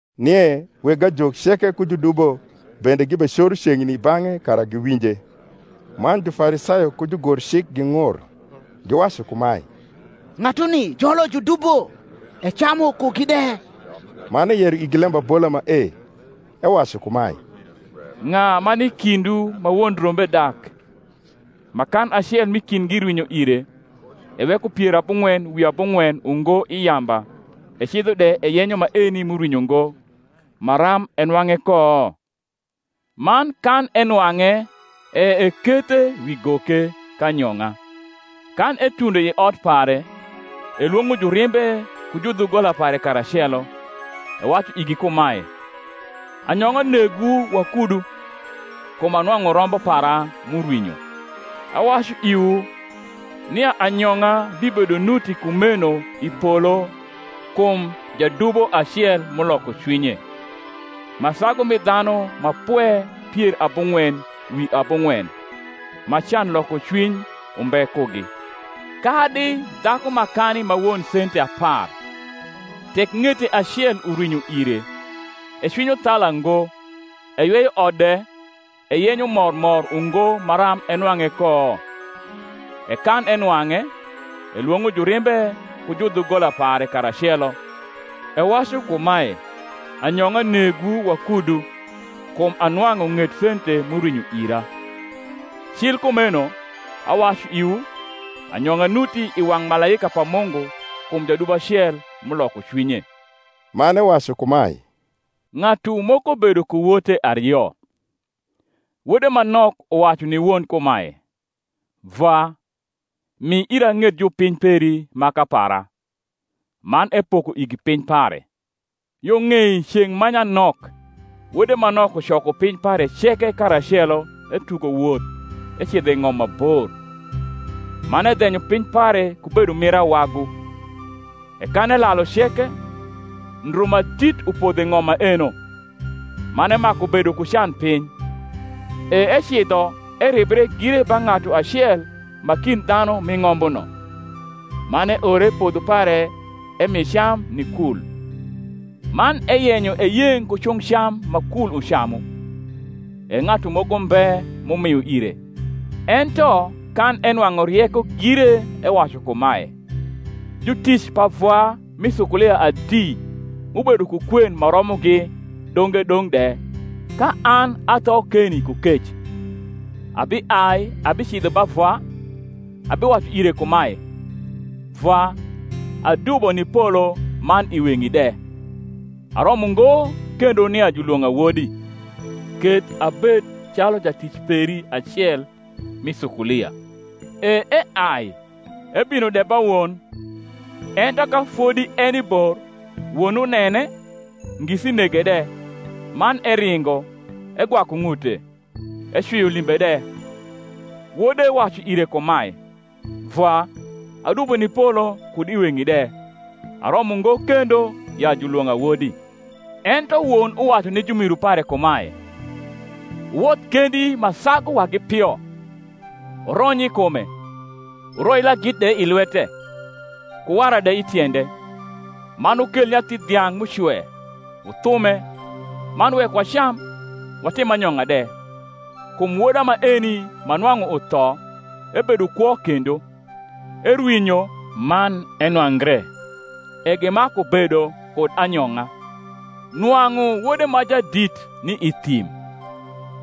Nie weg ajok ceke ku judubo bende gibecoro ceng’ni i bang’e kara giwinje. Man Jufarisayo ku jugorcik ging’ur, giwacu kumae, Ng’atuni jolo judubo, ecamu kugi de. Man eyero igi lembabola mae, ewacu kumae, Ng’a ma ni i kindwu ma won rombe dak, ma kan acel m’i kindgi rwinyo ire, eweko pier abung’wen wi abung’wen ungo i yamba, ecidho de eyenyo maeni m’urwinyo ngo, maram enwang’e ko? Man kan enwang’e, e ekethe wi goke, k’anyong’a. Kan etundo i ot pare, elwong’o jurimbe ku judhugola pare karacelo, ewacu igi kumae, Anyong’a negwu wakudu, kum anwang’u rombo para m’urwinyo. Awacu iwu, nia anyong’a bibedo nuti kumeno i polo kum jadubo acel m’uloko cwinye, ma sagu mi dhanu ma pwe pier abung’wen wi abung’wen, ma can loko cwiny umbe kugi. Kadi dhaku makani ma won sente apar, tek ng’ete acel urwinyo ire, ecwinyo thala ngo, eyweyo ot de, eyenyo mor mor ungo maram enwang’e ko? E kan enwang’e, elwong’o jurimbe ku judhugola pare karacelo, ewacu kumae, Anyong’a negwu wakudu, kum anwang’u ng’et sente m’urwinyo ira. Cil kumeno, awacu iwu, Anyong’a nuti i wang’ malaika pa Mungu kum jadubo acel m’uloko cwinye. Man ewacu kumae, Ng’atu moko bedo ku wote ario: wode ma nok uwacu ni won kumae, Vwa, mi ira ng’et jupiny peri maka para. Man epoko igi piny pare. Yo ng’ei ceng’ ma nyanok, wode ma nok ucoko piny pare ceke karacelo etugo woth ecidho i ng’om ma bor; man edhenyo piny pare ku bedo mir awagu. E kan elalu ceke, ndru ma dit upodho i ng’om maeno; man emaku bedo ku can piny. E ecidho eribre gire ba ng’atu acel ma kind dhanu m’i ng’ombuno; man eore i podho pare emi cam ni kul. Man eyenyo eyeng’ ku cung’ cam ma kul ucamu: e ng’atu moko mbe m’umio ire. Ento kan enwang’u rieko gire ewacu kumae, Jutic pa vwa mi sukulia adi m’ubedo ku kwen ma romogi donge dong’ de, ka an atho keni ku kec! Abiai abicidho ba vwa, abiwacu ire kumae, Vwa, adubo ni polo man i weng’i de; aromo ngo kendo nia julwong’a wodi; keth abed calu jatic peri acel mi sukulia. E eai, ebino de ba won. Ento ka fodi eni bor, won unene, ngisi nege de, man eringo, egwaku ng’ute, ecwio limbe de. Wode wacu ire kumae, Vwa, adubo ni polo, kud i weng’i de: aromo ngo kendo ya julwong’a wodi. Ento won uwacu ni jumiru pare kumae, Wuwodh kendi ma sagu wagi pio, wurony i kume; wuroi lagith de i lwete, ku wara de i tiende: man wukel nyathi dhiang’ m’ucwe, wuthume, man wek wacam, watim anyong’a de: kum woda maeni ma nwang’u utho, ebedo kwo kendo; erwinyo, man enwangre. E gimaku bedo kud anyong’a. Nwang’u wode ma jadit ni i thim: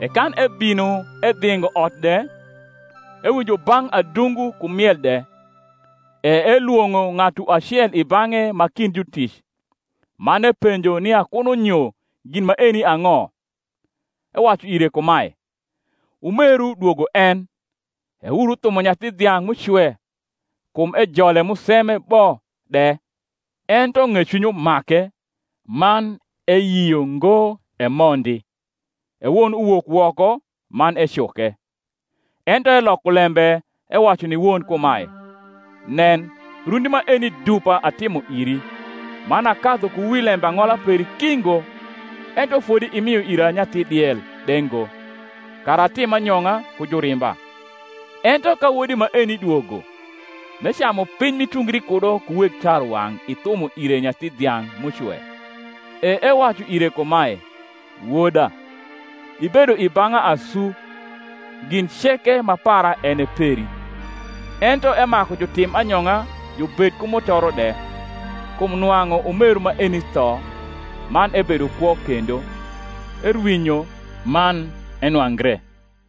e kan ebino edhingo ot de, ewinjo bang’ adungu ku miel de. E elwong’o ng’atu acel i bang’e ma kind jutic, man epenjo nia kuno nyo gin maeni ang’o. Ewacu ire kumae, Umeru dwogo en; e wuru thumo nyathi dhiang’ m’ucwe, kum ejole museme bo de. Ento ng’ecwiny umake, man eyio ngo emondi: e won uwok woko, man ecuke. Ento eloko lembe ewacu ni won kumae, Nen, rundi maeni dupa atimo iri, man akadhu ku wi lembang’ola peri ki ngo; ento fodi imio ira nyathi diel de ngo, kara atim anyong’a ku jurimba: ento ka wodi maeni dwogo, m’ecamu piny m’itungri kudo ku weg tarwang’ ithumo ire nyathi dhiang’ m’ucwe. E ewacu ire kumae, Woda, ibedo i bang’a asu, gin ceke ma para en e peri. Ento emaku jutim anyong’a jubed ku mutoro de: kum nwang’u umeru maeni tho, man ebedo kwo kendo; erwinyo, man enwangre.